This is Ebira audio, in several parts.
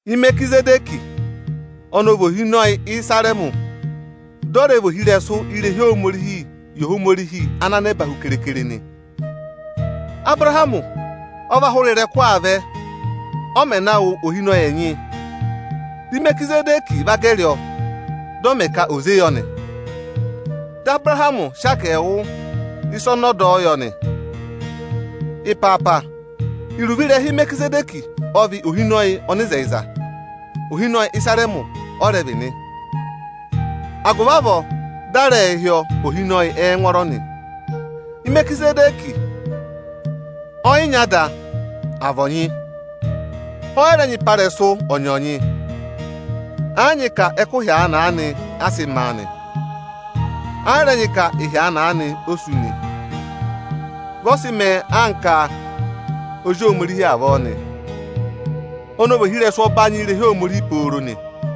Imerikizẹdẹkị ọnọọ vị ohinọyị Ịsarẹmị, dị ọ rẹ vị ohirẹsụ irehi Ohomorihi yị Ohomorihi ana nẹba hu keekere nị. Abụrahamị ộ và hụrị ịrẹkụ aa vẹ, ọ mẹ̀ na wụ ohinọyị ẹnyị aanị. Imerikizẹdẹkị ộ va gẹrị ọ, dị ọ mẹ̀ aduwaa yọ nị. Dị Abụrahamị sị agẹẹwụ ịsa ọnị ọ dọ yọ nị. Ịpaapa, iruvo ịrẹha Imerikizẹdẹkị ọ vị Ohinọyị Ọnịzẹyịza; ohinọyị Ịsarẹmị ọ vị nị, agụvị avọọ, dị a rẹẹ̄ hị́ ọ ohinọyị ẹngwọọrọ nị. Imerikizẹdẹkị ọ yị nyị ada, à vị ọnyị, ọ yị rẹ nyị ịpa ịrẹsụ ọnyọọnyị. Ẹ́ yị nyị ka ẹkụhị aanị-aanị a sị maa nị, ẹ́ yị rẹ nyị ka ịhị aanị-aanị o sú nị. Vị ọ sị mẹẹ anka Ozi Ohomorihi avọọ nị, ọnị ọ vị ohirẹsụ ọbanyị irehi Ohomorihi pooro nị.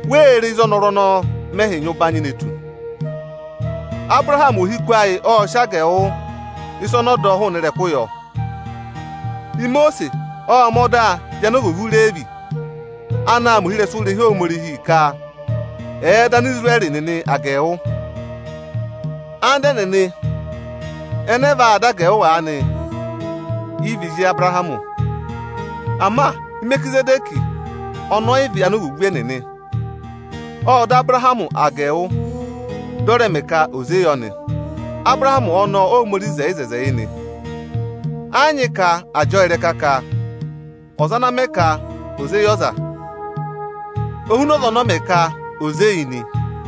Wéé re ịzị ọnọrụ ọnọọ mẹhị nyị ụbanyị ne tu? Abụrahamị ohiku ayị ộ sị agẹẹwụ ịsa ọnị ọ dọ yọ. Imosiisi ộ mẹ̀ ọda yị anovwoovu Ireevi anaā mẹ ohirẹsụ irehi Ohomorihi ka ẹ̀ẹ dọ Anisirẹrị nịnị agẹẹwụ. Anda ẹnịnị ẹnẹ ẹyaa dọ agẹẹwụ aanị yị vị ezi Abụrahamị. Ama Imerikizẹdẹkị ọnị ọ yị vị anovwoovu ẹnịnị, ộ dọ Abụrahamị agẹẹwụ, dị ọ rẹ mẹ̀ aduwa yọ nị. Abụrahamị ọnọọ Óhomorihi hị́ eku yị nị. Ẹ yị nyị ka àa jị ọ ịrẹka ka ọza ana mẹ ka ò zé yị ọza o huna ọza ọnị ọ mẹ ka ò zé yị nị.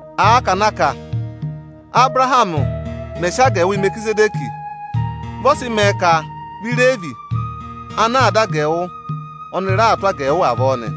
Àa ka na kà a, Ábụrahamị mẹ sị agẹẹwụ yị Imerikizẹdẹkị, vị ọ sị mẹẹ ka vị Ireevi anaā dọ agẹẹwụ, ọnị raa tụ́ agẹẹwụ avọọ nị.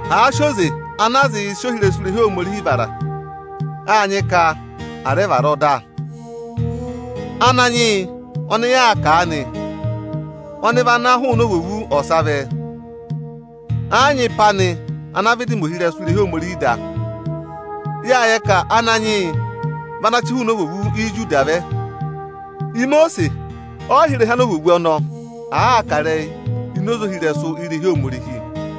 Àa sị oze ana a zịị̄ sị ohirẹsụ irehi Ohomorihii vara, áa nyị ka à rẹ vara ọda. Ananyị yị ọnị yaa kà aanị, ọnị vị ana hụụnị ovwoovu ọsa vẹ. Ẹẹ̀ yị nyị ịpa anị ana vịdị mẹ ohirẹsụ irehi Ohomorihi da. Yâ yẹ ka Ananyị yị vị ana chị hụụnị ovwoovu Ijuda vẹ. Imosiisi ọ yị hị́ ịrẹha anovwoovu ọnọọ, àaa kà ịrẹyị ini oze ohirẹsụ irehi Ohomorihi.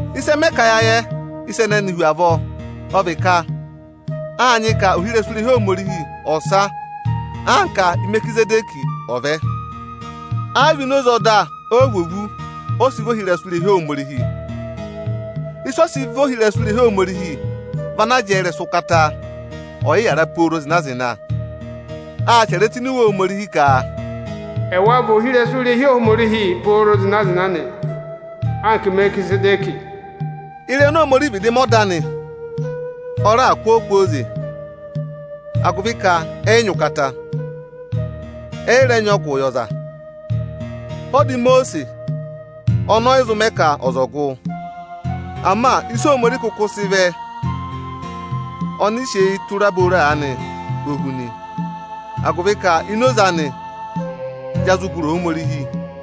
Ịsị ẹ mẹ ka ya yẹ ịsa ẹnẹnị hu avọọ, ọ vị ka áa nyị ka ohirẹsụ irehi Ohomorihi ọsa anka Imerikizẹdẹkị ọ̀ vẹ nị. Ẹ yị vị oze ọda Ovwoovu ọ sị vị ohirẹsụ irehi Ohomorihi. Ịsị ọ sị vị ohirẹsụ irehi Ohomorihi vị ana jẹẹ ịrẹsụ ụkata ọyịyara pooro zịna-zịna. Â chẹrẹ ẹ tụ́ ini Iwe Ohomorihi ka: Ẹwa vị ohirẹsụ irehi Ohomorihi pooro zịna-zịna anka Imerikizẹdẹkị nị. Ịrẹyị oni Ohomorihi vịdị mẹ ọda anị, ọ raà kụ́ ọ kwooze agụvị ka ẹ yị nyị ụkata, ẹ yị rẹ nyị ọgụ yị ọza. Ọda Imosiisi ọnọọ ọ yị zụ mẹ ka ọza gụ. Ama ịsị Ohomorihi kụkụ sị vẹ, ọnị sị eyi tụra booro aanị o hu nị, agụvị ka ini oze anị ya zụ gụrị Ohomorihi.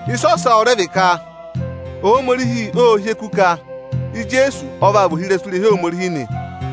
Ịsa ọsa ọ rẹ vị ka Ohomorihi ộ hị́ eku ka Ijeesu ọ vaa vị ohirẹsụ irehi Ohomorihi nị.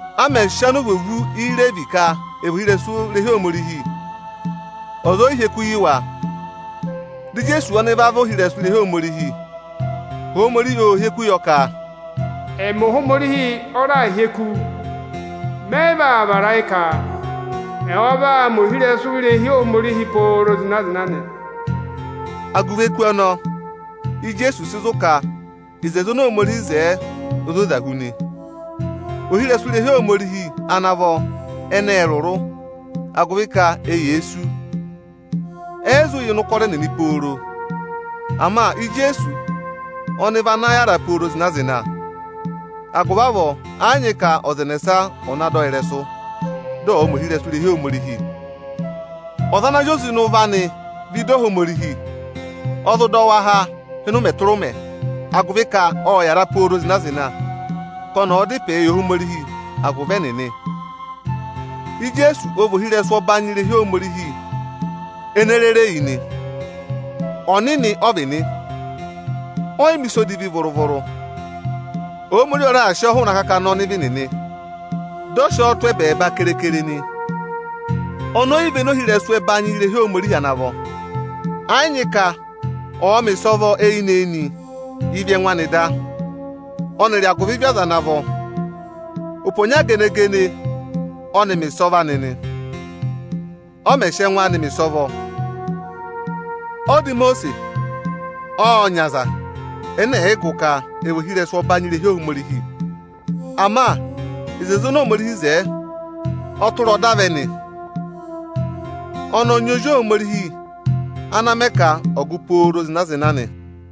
A mẹ̀ sị anovwoovu Ireevi ka ẹ̀ vị ohirẹsụ irehi Ohomorihi, ọza ọ yị hị́ eku yị wa. Dị Ijeesu ọnị va vị ohirẹsụ irehi Ohomorihi, Ohomorihi ộ hị́ eku yọ ka: Ọnị Ohomorihi ọ raà hị́ eku, ọnị ẹ yị vaa vara ayị ka: ẹwa vaa mẹ ohirẹsụ irehi Ohomorihi pooro zịna-zịna nị. Agụvị eku ọnọọ, Ijeesu sị zụ̀ ka oto oni Ohomorihi wo o zoza hu nị. Ohirẹsụ irehi Ohomorihi ana vọ ẹnị ẹ́ẹ rụrụ, agụvị ka eyee sú, ẹ yị zụ yà ịnị ụkọrọ ẹnịnị pooro zịna-zịna. Ama Ijeesu ọnị vị ana yára pooro zịna-zịna. Agụvị avọọ, ẹ yị nyị ka ọza ẹnẹsa ọ̀ na dọ ọ ịrẹsụ, dị ọ̀ọ mẹ ohirẹsụ irehi Ohomorihi. Ọza ana àa zị oze ịnị ụvọ anị vẹ ịdị Ohomorihi, ọ zụ dọ wa há ịnị ụmẹ tụra ụmẹ, agụvị ka ọ́ọ yàra pooro zịna-zịna ka ọnị ọ̀ọ da ịpẹẹ yị Ohomorihi agụvị ẹnịnị. Ijeesu ọ vị ohirẹsụ ọbanyị irehi Ohomorihi ene rere yi nị. Ọnịnị ọ vị nị, ọ yị mẹ̀ ịsa odivi vụrụ-vụrụ. Ohomorihi ọ raà sị ọ hụụnị akakana ọnịvị nịnị, dị ọ sị ọ tụ́ ẹbẹẹba keekere nị. Oni e yi véné ohirẹsụ ẹbanyị irehi Ohomorihi ana vọ. Ẹ yị nyị ka ọ̀ọ mẹ̀ ịsọvọ eyinị-eyinị yị ịvị ẹngụ anị da, ọnịrị agụvị ịvị aza ana vọ. Ụpẹ ọnya gene-gene ọnị mẹ̀ ịsọvọ anị nị, ụmẹ ọnị ọ sị ẹngụ anị mẹ̀ ịsọvọ. Ọda Imosiisi ộ nyị aza ẹnẹ ẹ̀ yị gụ ka ẹ vị ohirẹsụ ọbanyị irehi Ohomorihi. Ama oto oni Ohomorihi wo, ọ tụra ọda vẹ nị. Ọnị ọ nyị Ozi Ohomorihi ana a mẹ ka ọ gụ pooro zịna-zịna nị.